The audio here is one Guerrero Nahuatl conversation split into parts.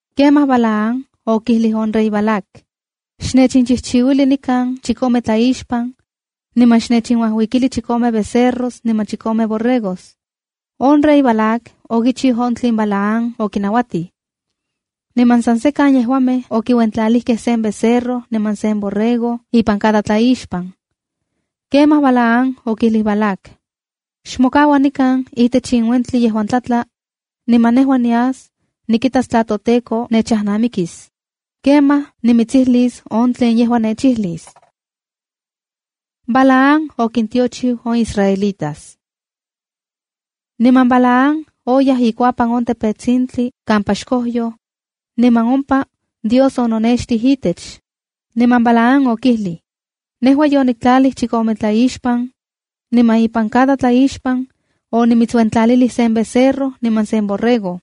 Kemaj Balaam okijlij on rey Balac: —Xnechchijchiuili nikan chikome tlaixpan, niman xnechinuajuikili chikome becerros niman chikome borregos. On rey Balac okichiu on tlen Balaam okinauatij. Niman san sekan yejuamej okiuentlalijkej sen becerro niman sen borrego ipan cada tlaixpan. Kemaj Balaam okijlij Balac: —Xmokaua nikan itech in uentli yejuan tlatla, niman nejua nias nikitas tla toTEKO nechajnamikis. Kemaj nimitsijlis on tlen yejua nechijlis. Balaam okintiochiu on israelitas Niman Balaam oyaj ikuapan sen tepetsintli kampa xkojyoj, niman ompa Dios ononextij itech, niman Balaam okijlij: —Nejua yoniktlalij chikome tlaixpan, niman ipan cada tlaixpan onimitsuentlalilij sen becerro niman sen borrego.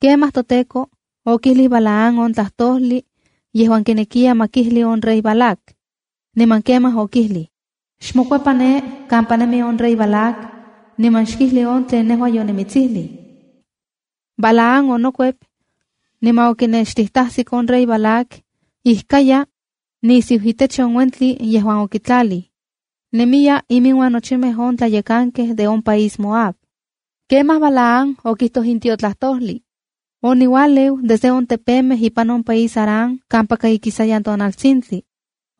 Kemaj toTEKO okijlij Balaam on tlajtojli yejuan kinekiya ma kijli on rey Balac. Niman kemaj okijlij: —Xmokuepa ne kampa nemi on rey Balac, niman xkijli on tlen nejua yonimitsijlij. Balaam onokuep, niman okinextijtajsik on rey Balac ijkaya nisiu itech on uentli yejuan okitlalij. Nemiya iminuan nochimej on tlayekankej de on país Moab. Kemaj Balaam okijtoj in tiotlajtojli: “Oniualeu desde on tepemej ipan on país Aram kampaka ikisayan tonaltsintli.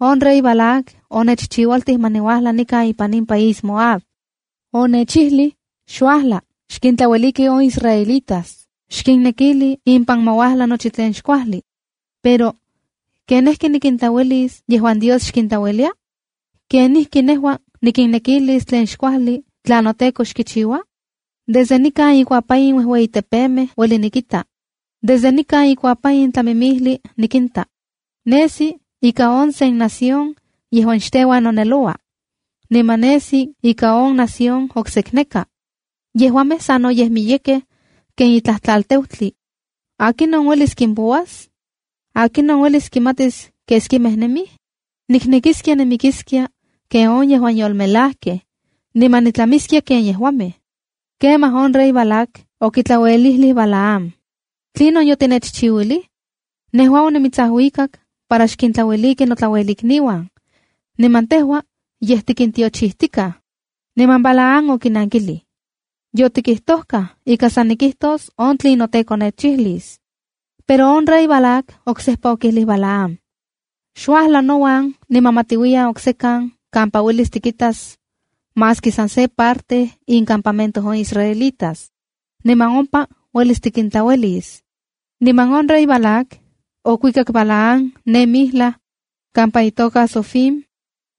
On rey Balac onechchiualtij ma niuajla nikan ipan in país Moab. Onechijlij: ‘Xuajla, xkintlaueliki on israelitas.’ Xkinnekili impan ma uajla nochi tlen xkuajli’ Pero, ¿kenijki nikintlauelis yejuan Dios xkintlauelia? ¿Kenijki nejua nikinnekilis tlen xkuajli tla noTEKO xkichiua? Desde nikan ikuapan in uejueyitepemej ueli nikita. Desde nikan ikuapan in tlamimijli nikinta. Nesi ika on sen nación yejuan xteuan noneloua. Niman nesi ika on nación oksekneka. Yejuamej sanoyej miyekej ken itlaj tlalteutli. ¿Akinon uelis kimpouas? ¿Akinon uelis kimatis keskimej nemij? Niknekiskia nimikiskia ken on yejuan yolmelajkej, niman nitlamiskia ken yejuamej.” Kemaj on rey Balac okitlauelijlij Balaam: —¿Tlinon yotinechchiuilij? ¡Nejua onimitsajuikak para xkintlaueliki notlauelikniuan, niman tejua yej tikintiochijtikaj! Niman Balaam okinankilij: —Yotitokajkaj ika san nikijtos on tlen noTEKO nechijlis. Pero on rey Balac oksejpa okijlij Balaam: —Xuajla nouan, niman ma tiuiyan oksekan kampa uelis tikitas maski san se parte incampamento on israelitas, niman ompa uelis tikintlauelis. Niman on rey Balac okuikak Balaam ne mijlaj kampa itoka Zofim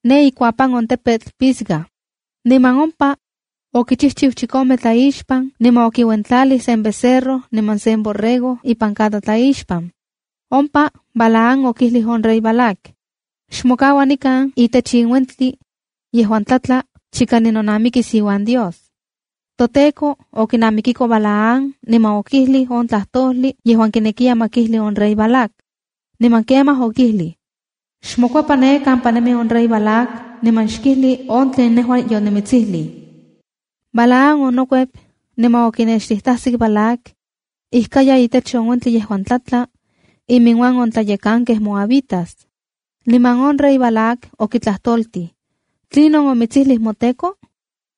ne ikuapan on tepetl Pisga. Niman ompa okichijchiu chikome tlaixpan niman okiuentlalij sen becerro niman sen borrego ipan cada tlaixpan. Ompa Balaam okijlij on rey Balac: —Xmokaua nikan itech in uentli yejuan tlatla chika nejua ninonamikis iuan Dios. ToTEKO okinamikiko Balaam niman okijlij on tlajtojli yejuan kinekiya ma kijli on rey Balac. Niman kemaj okijlij: —Xmokuepa ne kampa nemi on rey Balac niman xkijli on tlen nejua yonimitsijlij. Balaam onokuep niman okinextijtasik Balac ijkaya itech on uentli yejuan tlatla, iminuan on tlayekankej moabitas. Niman on rey Balac okitlajtoltij: —¿Tlinon omitsijlij moTEKO?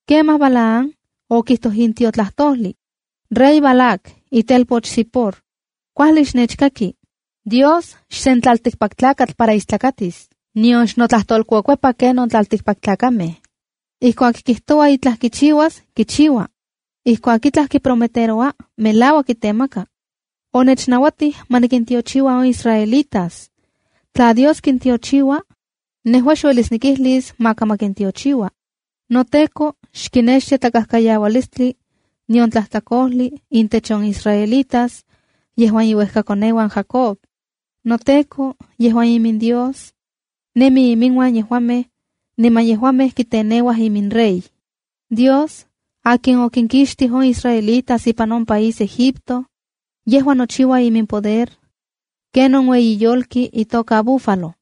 Kemaj Balaam okijtoj in tiotlajtojli: “¡Rey Balac, itelpoch Zipor, kuajli xnechkaki! Dios xsen tlaltikpaktlakatl para istlakatis. Nion xnotlajtolkuekuepa kenon tlaltikpaktlakamej. Ijkuak kijtoua itlaj kichiuas, kichiua. Ijkuak itlaj kiprometeroua, melauak kitemaka. Onechnauatij ma nikintiochiua on israelitas. Tla Dios kintiochiua, nejua xuelis nikijlis maka ma kintiochiua. NoTEKO xkinextia tlakajkayaualistli, nion tlajtlakojli intech on israelitas yejuan iuejkakoneuan Jacob. NoTEKO yejuan iminDios, nemi iminuan yejuamej, niman yejuamej kiteneuaj iminrey. Dios, akin okinkixtij on israelitas ipan on país Egipto, yejua nochiua iminpoder kenon ueyi yolki itoka búfalo.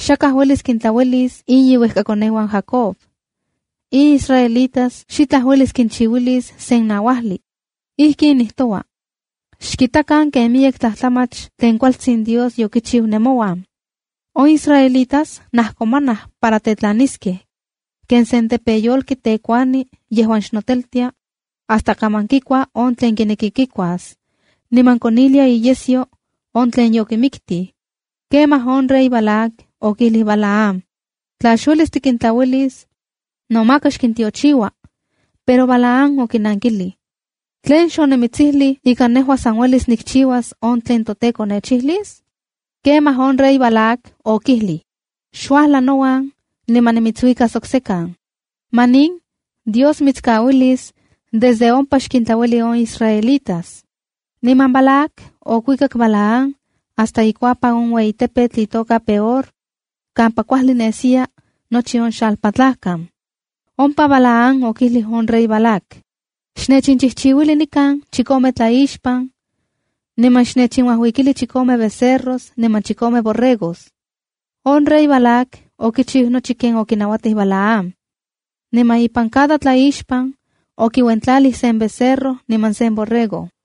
Xakaj uelis kintlauelis in iuejkakoneuan Jacob. In israelitas xitlaj uelis kinchiuilis sen nauajli. Ijkin nijtoua: ‘¡Xkitakan ken miyek tlajtlamach tlen kualtsin Dios yokichiu nemouan!’ On israelitas najkomanaj para tetlaniskej ken sen tepeyolki tekuani yejuan xnoteltia hasta kaman kikua on tlen kineki kikuas, niman konilia iyesyo on tlen yokimiktij.” Kemaj on rey Balac okijlij Balaam: —Tla xuelis tikintlauelis, no maka xkintiochiua. Pero Balaam okinankilij: ¿Tlen xonimitsijlij ika nejua san uelis nikchiuas on tlen noTEKO nechijlis? Kemaj on rey Balac okijlij: —Xuajla nouan niman nimitsuikas oksekan. Manin, Dios mitskauilis desde ompa xkintlaueli on israelitas. Niman Balac okuikak Balaam hasta ikuapan on ueyi tepetl itoka Peor kampa kuajli nesiya nochi on xalpatlajkan. Ompa Balaam okijlij on rey Balac: —Xnechchijchiuili nikan chikome tlaixpan, niman xnechinuajuikili chikome becerros niman chikome borregos. On rey Balac okichiu nochi ken okinauatij Balaam. Niman ipan cada tlaixpan okiuentlalij sen becerro niman sen borrego.